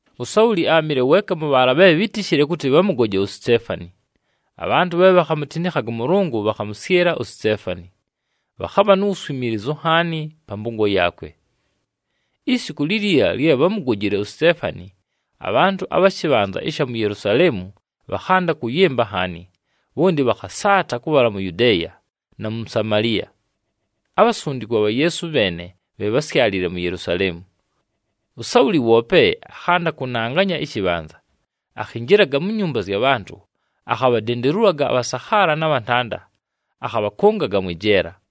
USauli áamɨle weeka mʉ bhaala bhe bhítishile kʉtɨ bhamʉgoje uSiteefani. Abhantʉ bhe bhakhamutinikhaga ʉMʉlʉngʉ bhakhamʉsyɨla uSiteefani. Bhakhabha nu wuswimiilizu nhaani pa mpʉngo yaakwe. Isiku liliila lye bhámugojile uSiteefani, abhantʉ abha shɨbhanza ɨsha mu Yelusaleemu bhakhanda kʉyɨmba nhaani, bhonti bhakhasaata kʉbhala mu Yudeeya, na mu Samaliya. Abhasundikwa bha Yeesu bheene bhe bhásyalile mu Yelusaleemu. USauli woope akhanda kʉnanganya ɨshɨbhanza. Akhinjilaga mu nyumba zya bhantʉ, akhabhadendelulaga abhasakhaala na bhantanda, akhabhakʉngaga mwɨ jeela.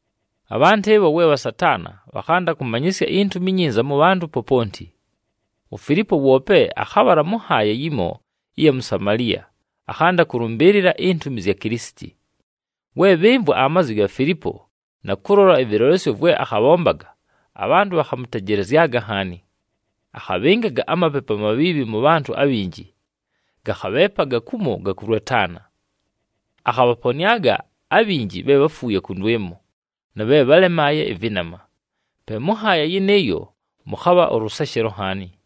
Abhantʉ ɨbho we bhasataana, bhakhanda kʉmanyɨsya iNtumi iNyinza mʉ bhantʉ poponti. UFilipo woope akhabhala mʉ nhaaya yimo ɨya mu Samaliya, akhanda kʉlʉmbɨɨlɨla intumi zya Kilisiti. We bhɨmvwa amazwi ga Filipo, na kʉlola ɨvɨlolesyo vwe akhabhombaga, abhantʉ bhakhamʉtejelezyaga nhaani. Akhabhɨngaga amapepu amabhiibhi mʉ bhantʉ abhinji, gakhabheepaga kumo gakʉlwetaana. Akhabhaponɨaga abhinji bhe bháfuuye kʉndwɨmo, na bhe bhálemaaye ɨvɨnama. Pe mʉ nhaaya yɨnɨɨyo mʉkhabha ʉlʉseshelo nhaani.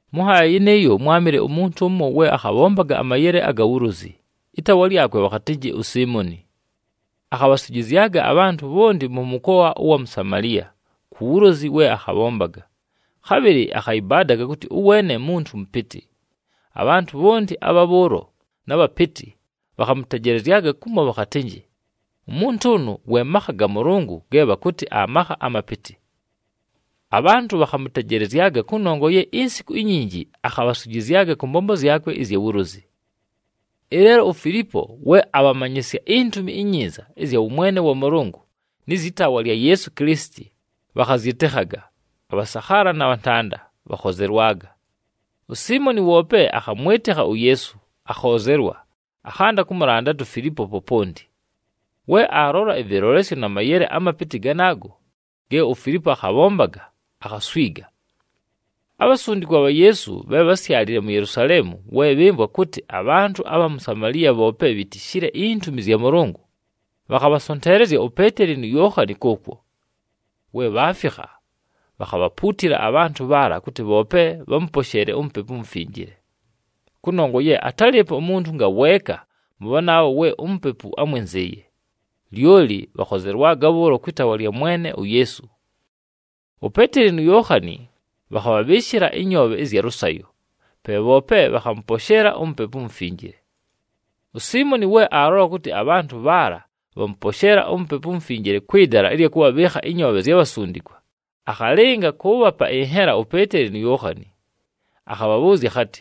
Mʉ nhaaya yɨnɨɨyo, mwámɨle umuntu ʉmo we akhabhombaga amayele aga wulozi, ɨtaawa lyakwe bhakhatɨnjɨ uSiimoni. Akhabhaswijizyaga abhantʉ bhonti mʉ mʉkoa ʉwa mu Samaliya ku wulozi we akhabhombaga, khabhɨlɨ akhayɨbaadaga kʉtɨ ʉweene muntu mʉpɨtɨ. Abhantʉ bhonti, abha bhʉʉlo na bhapɨtɨ, bhakhamʉtejelezyaga kumo bhakhatɨnjɨ, “Umuntu ʉnʉ we makha ga Mʉlʉngʉ ge bhakʉtɨ aMakha aMapɨtɨ.” Abhantʉ bhakhamʉtejelezyaga kʉnongwa ye insiku inyinji akhabhaswijizyaga kʉ mbombo zyakwe ɨzya wulozi. Ɨleelo uFilipo we abhamanyɨsya iNtumi iNyinza ɨzya wʉmwene wa Mʉlʉngʉ, nɨ zyɨ taawa lya Yeesu Kilisiti, bhakhazyɨtɨkhaga, abhasakhaala na bhantanda, bhakhozelwaga. USiimoni woope akhamwɨtɨkha uYeesu, akhoozelwa, akhanda kʉmʉlandata uFilipo poponti. We aalola ɨvɨlolesyo na mayele amapɨtɨ ganaago ge uFilipo akhabhombaga, akhaswiga. Abhasundikwa bha Yeesu bhe bhásyalile mu Yelusaleemu, we bhɨmvwa kʉtɨ abhantʉ abha mu Samaliya bhoope bhitishile intumi zya Mʉlʉngʉ, bhakhabhasonteelezya uPeeteli nu Yookhani kʉʉkwo. We bhaafikha, bhakhabhapuutila abhantʉ bhaala kʉtɨ bhoope bhamʉposheele uMupepu uMufinjile. Kʉnongwa ye atálɨɨpo umuntu ngaweeka mʉ bhanaabho we uMupepu ámwɨnzɨɨye, lyoli bhakhozelwaga bhʉʉlo kwɨ taawa lya Mwene uYeesu. UPeeteli nu Yookhani bhakhabhabhɨɨshɨla ɨnyoobhe ɨzya lʉsayo, pe bhoope bhakhamʉposheela uMupepu uMufinjile. USiimoni we aalola kʉtɨ abhantʉ bhaala bhamʉposheela uMupepu uMufinjile kwɨ dala ɨlya kʉbhabhɨɨkha ɨnyoobhe zya bhasundikwa, akhalɨnga kʉʉbhapa ɨnhela uPeeteli nu Yookhani. Akhabhabhʉʉzya akhatɨ,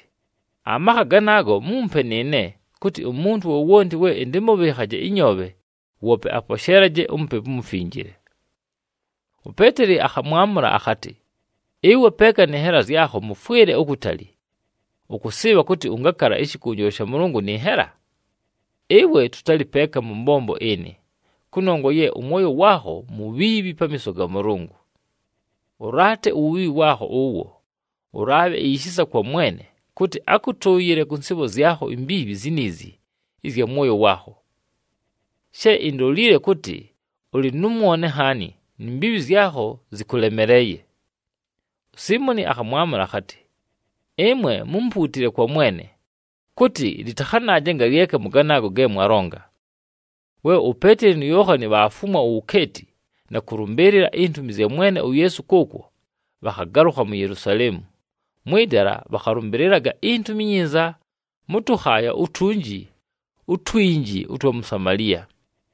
“Amakha ganaago, mumpe nɨɨne, kʉtɨ umuntu wowonti we ɨntɨmʉbhɨɨkhaje ɨnyoobhe, woope aposheelaje uMupepu uMufinjile.” UPeeteli akhamwamʉla akhatɨ, “Ɨwe peeka nɨ nhela zyakho, mʉfwɨle ukutali! Ʉkʉsɨɨbha kʉtɨ ʉngakala ɨshɨkʉnjɨlwa sha Mʉlʉngʉ nɨ nhela! Ɨwe tʉtalɨ peeka mʉ mbombo ɨnɨ, kʉnongwa ye ʉmwoyo waakho mubhiibhi pamiiso ga Mʉlʉngʉ. Ʉlaate uwubhiibhi waakho ʉwo, ʉlaabhe ishisa kwa Mwene, kʉtɨ akʉtʉʉyɨle kʉ nsɨɨbho zyakho imbiibhi ziniizi ɨzya mwoyo waakho. She indolile kʉtɨ ʉlɨ nʉ mwone nhaani, ni mbiibhi zyakho zɨkʉlemeleeye.” USiimoni akhamwamʉla akhatɨ, “Ɨmwe mumpuutile kwa Mwene, kʉtɨ lɨtakhanaaje ngalyeka mʉ ganaago ge mwalonga!” We uPeeteli nu Yookhani bhaafumwa uwukeeti, na kʉlʉmbɨɨlɨla intumi zya Mwene uYeesu kʉʉkwo, bhakhagalʉkha mu Yelusaleemu, mwɨ dala bhakhalʉmbɨlɨlaga iNtumi iNyinza mʉ tʉkhaaya utunji utwinji ʉtwa mu Samaliya.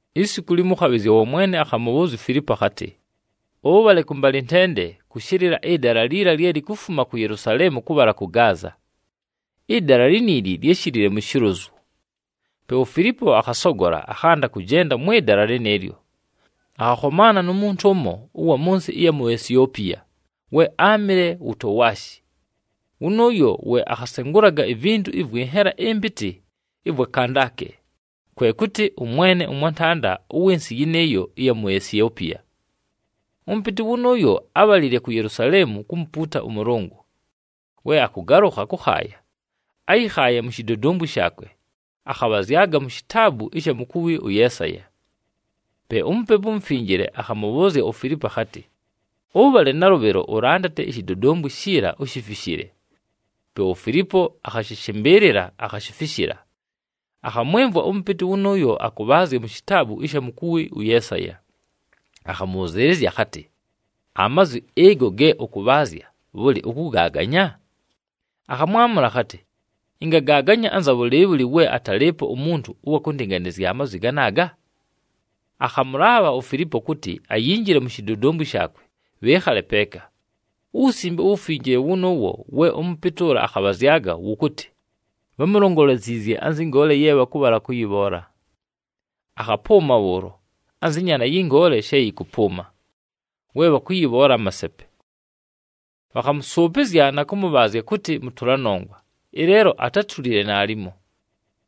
Isiku limo, ʉkhabhɨzya wa Mwene akhamʉbhʉʉzya uFilipo akhatɨ, “Ʉbhale kʉmbalɨntende kʉshɨlɨla ɨdala liila lye likufuma ku Yelusaleemu kʉbhala kʉ Gaaza.” Ɨdala liniili lyáshilile mu shilozu. Pe uFilipo akhasogola, akhanda kʉjenda mwɨ dala lɨnɨɨlyo, akhakhomaana nu muntu ʉmo ʉwa mʉ nsɨ ɨya mu Esiopiya we áamɨle wutowashi. Wʉnʉʉyo we akhasengulaga ivintu ɨvwɨ nhela ɨmpɨtɨ ɨvwa Kandake, kwe kʉtɨ, ʉmwene ʉmwantanda ʉwɨ nsɨ yɨnɨɨyo ɨya mu Esiopiya. Ʉmʉpɨtɨ wʉnʉʉyo ábhalile ku Yelusaleemu kumupuuta ʉMʉlʉngʉ. We akʉgalʉkha kʉkhaaya, áyɨkhaaye mu shidodombwi shaakwe, akhabhazyaga mu shitaabu ɨsha mukuwi ʉYeesaya. Pe uMupepu uMufinjile akhamʉbhʉʉzya uFilipo akhatɨ, “Ʉbhale nalʉbhɨlo ʉlandate ishidodombwi shiila, ushifishile.” Pe uFilipo akhashɨshɨmbɨɨlɨla, akhashifishila. Akhamwɨmvwa ʉmʉpɨtɨ wʉnʉʉyo akʉbhaazya mu shitaabu ɨsha mukuwi ʉYeesaya, akhamʉbhʉzɨɨlɨzya akhatɨ, “Amazwi ɨgo ge ʉkʉbhaazya, bhʉlɨ, ʉkʉgaaganya?” Akhamwamʉla akhatɨ, “Ɨngagaaganya anza bhʉlɨɨbhʉlɨ we atalɨɨpo umuntu ʉwa kʉndɨnganɨzya amazwi ganaaga?” Akhamʉlaabha uFilipo kʉtɨ ayinjile mu shidodombwi shaakwe, bhɨɨkhale peeka. UWusimbe uWufinjile wʉnʉʉwo we ʉmʉpɨtɨ ʉla akhabhazyaga, wʉkʉtɨ, “Bhámulongoleziizye anzɨ ngoole ye bhakʉbhala kʉyɨbhoola. Akhapʉʉma bhʉʉlo, anzɨ nyaana yɨ ngoole she yɨkʉpʉʉma, we bhakʉyɨbhoola amasepe. Bhakhamʉsʉʉpɨzya na kʉmʉbhaazya kʉtɨ mʉtʉla nongwa, ɨleelo atátulile naalimo.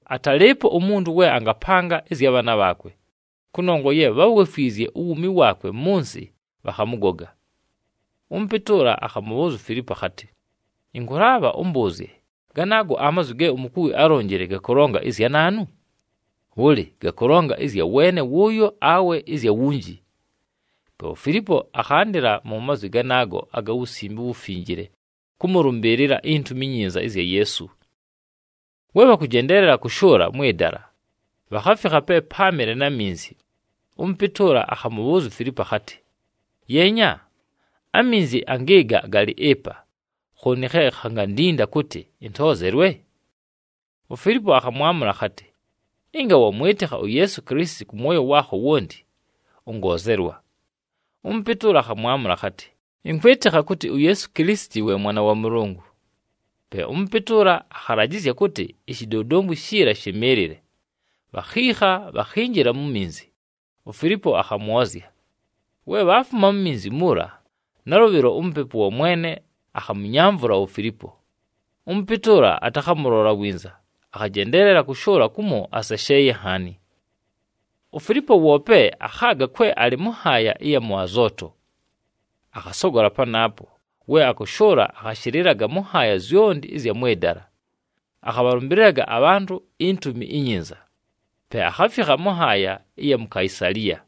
Atalɨɨpo umuntu we angapanga ɨzya bhaana bhaakwe, kʉnongwa ye bháwefwizye uwuumi waakwe mʉ nsɨ, bhakhamʉgoga.” Ʉmʉpɨtɨ ʉla akhamʉbhʉʉzya uFilipo akhatɨ, “Ɨnkʉlaabha ʉmbʉʉzye, ganaago amazwi ge umukuwi álonjile gakʉlonga ɨzya naanu? Bhʉlɨ, gakʉlonga ɨzya weene wʉʉyo, awe ɨzya wunji?” Pe uFilipo akhandɨla mu mazwi ganaago aga Wusimbe uWufinjile kʉmʉlʉmbɨɨlɨla iNtumi iNyinza ɨzya Yeesu. We bhakʉjendeelela kʉshʉʉla mwɨ dala, bhakhafikha pe páamɨle na minzi. Ʉmʉpɨtɨ ʉla akhamʉbhʉʉzya uFilipo akhatɨ, “Yeenya! Aminzi angɨɨga galɨ ɨpa. Khooni khe khangandinda kʉtɨ ɨntoozelwe?” [ UFilipo akhamwamʉla akhatɨ, “Ɨnga wamwɨtɨkha uYeesu Kilisiti kʉ mwoyo waakho wonti, ʉngoozelwa.” Ʉmʉpɨtɨ ʉla akhamwamʉla akhatɨ, “Ɨnkwɨtɨkha kʉtɨ uYeesu Kilisiti we Mwana wa Mʉlʉngʉ.”] Pe ʉmʉpɨtɨ ʉla akhalajɨzya kʉtɨ ishidodombwi shiila shɨmɨɨlɨle, bhakhiikha, bhakhinjila mu minzi, uFilipo akhamwozya. We bhaafuma mu minzi muula, nalʉbhɨlo uMupepu wa Mwene akhamʉnyamvʉla uFilipo. Ʉmʉpɨtɨ ʉla atakhamʉlola winza, akhajendeelela kʉshʉʉla kumo asesheeye nhaani. UFilipo woope akhaaga kwe alɨ mʉ nhaaya ɨya mʉ Azooto. Akhasogola panaapo, we akʉshʉʉla akhashɨlɨlaga mʉ nhaaya zyonti ɨzya mwɨ dala, akhabhalʉmbɨlɨlaga abhantʉ iNtumi iNyinza, pe akhafikha mʉ nhaaya ɨya mu Kaisaliya.